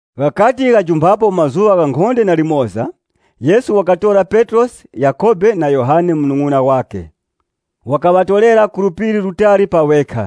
Ghakati ghajumphapo mazuŵa ghankhonde na limoza, Yesu wakatora Petrosi Yakhobe na Yohane munung'una wakhe. Wakaŵatorera ku phiri litali pa ŵekha.#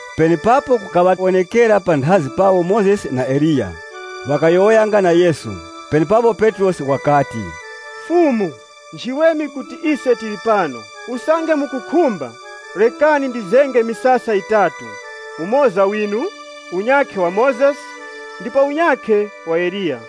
Penepapo kukaŵawonekera panthazi pawo Mozesi na Eliya, ŵakayowoyanga na Yesu. Penepapo Petrosi wakati, “Fumu, nchiweme kuti ise tili pano. Usange mukukhumba, rekani ndizenge misasa yitatu, umoza winu, unyakhe wa Mozesi, ndipo unyakhe wa Eliya.”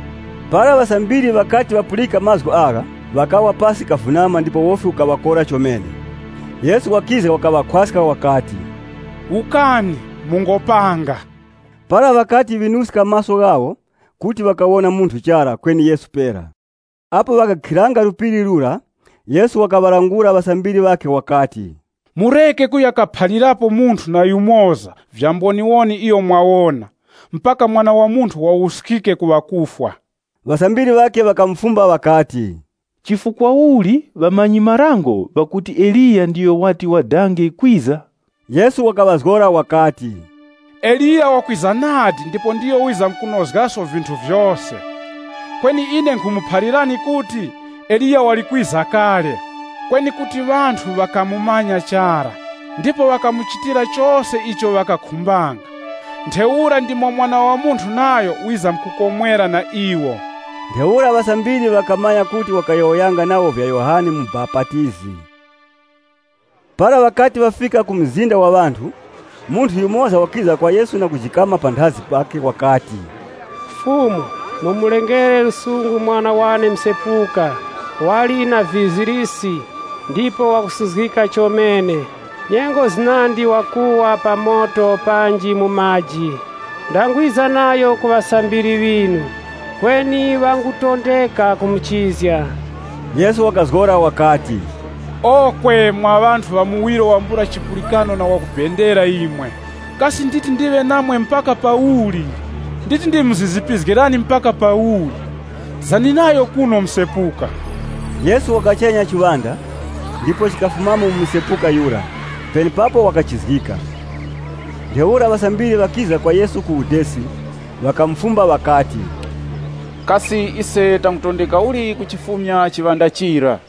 Para ŵasambiri ŵakati ŵapulika mazgu agha, ŵakawa pasi kavunama ndipo wofi ukaŵakora chomene. Yesu wakiza wakaŵakhwaska wakati, “Wukani, mungopanga.” Para ŵakati ŵinuska maso ghawo, kuti ŵakawona munthu chara, kweni Yesu pera. Apo ŵakakhiranga phiri lira, Yesu wakaŵalangula ŵasambiri ŵakhe wakati, “Mureke kuya kaphalirapo munthu waliyose vya mboniwoni iyo mwawona, mpaka Mwana wa Munthu wawuskike ku ŵakufwa.” Ŵasambiri ŵakhe ŵakamufumba ŵakati, “Chifukwa uli ŵamanyi-marango ŵakuti Eliya ndiyo wati wadange kwiza?” Yesu wakaŵazgora wakati, “Eliya wakwiza nadi ndipo ndiyo wizamkunozgaso vinthu vyose. Kweni ine nkhumuphalirani kuti, Eliya wali kwiza kale. Kweni kuti ŵanthu ŵakamumanya chara. Ndipo ŵakamuchitira chose icho ŵakakhumbanga. Ntheura ndimo na Mwana wa Munthu nayo wizamkukomwera na iwo.” Ntheura ŵasambiri ŵakamanya kuti wakayowoyanga nawo vya Yohane Mubapatizi. Para ŵakati ŵafika ku mzinda wa ŵanthu, munthu yumoza wakiza kwa Yesu na kujikama panthazi pakhe wakati, “Fumu, mumulengere lusungu mwana wane msepuka. Wali na vizirisi ndipo wakusuzgika chomene. Nyengo zinandi wakuwa pa moto panji mu maji. Ndangwiza nayo ku ŵasambiri ŵinu, kweni ŵangutondeka kumuchizga.” Yesu wakazgora wakati, “Okwe mwa ŵanthu ŵa muwiro wambula chipulikano na ŵakubendera imwe, kasi nditi ndiŵe namwe mpaka pauli? Nditi ndimuzizipizgirani mpaka pauli? Zani nayo kuno msepuka.” Yesu wakachenya chiŵanda, ndipo chikafumamo mu msepuka yura. Penepapo wakachizgika. Ntheura ŵasambiri ŵakiza kwa Yesu ku udesi, ŵakamufumba ŵakati, “Kasi ise tangutondeka uli kuchifumya chiŵanda chira?”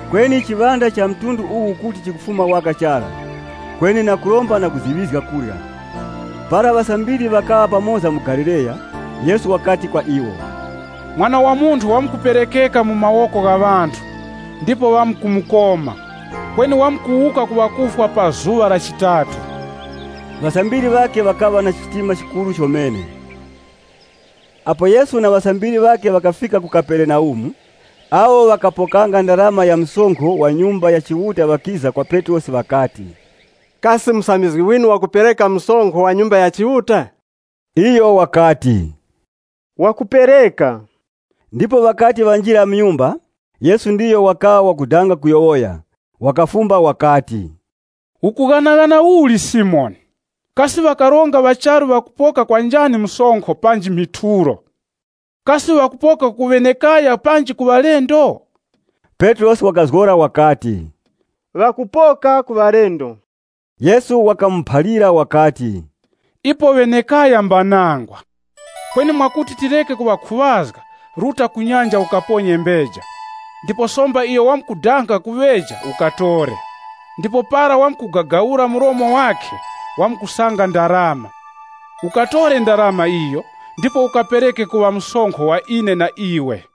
Kweni chiŵanda cha mtundu uwu kuti chikufuma waka chara, kweni na kuromba na kuziŵizga kurya.] Para ŵasambiri ŵakaŵa pamoza mu Galileya, Yesu wakati kwa iwo, “Mwana wa Munthu wamkuperekeka mu mawoko gha ŵanthu, ndipo ŵamkumukoma. Kweni wamkuwuka ku ŵakufwa pa zuŵa la chitatu.” Ŵasambiri ŵakhe ŵakaŵa na chitima chikuru chomene. Apo Yesu na ŵasambiri ŵakhe ŵakafika ku Kaperenaumu, awo ŵakapokanga ndarama ya msonkho wa Nyumba ya Chiuta ŵakiza kwa Petrosi ŵakati, “Kasi musambizgi winu wakupereka msonkho wa Nyumba ya Chiuta?” Iyo wakati, “Wakupereka.” Ndipo ŵakati ŵanjira mu nyumba, Yesu ndiyo wakaŵa wakudanga kuyowoya. Wakafumba wakati, “Ukughanaghana uli Simoni? Kasi ŵakaronga ŵa charu ŵakupoka kwa njani msonkho panji muthulo? Kasi ŵakupoka ku ŵana panji ku ŵalendo?” Petrosi wakazgora wakati, “Ŵakupoka ku ŵalendo.” Yesu wakamuphalira wakati, “Ipo ŵana mbanangwa. Kweni mwakuti tireke kuŵakhuŵazga, ruta ku nyanja ukaponye mbeja, ndipo somba iyo wamkudanga kuŵeja ukatore. Ndipo para wamkugagawura mlomo wakhe, wamkusanga ndarama. Ukatore ndarama iyo ndipo ukapereke kuŵa msonkho wa ine na iwe.”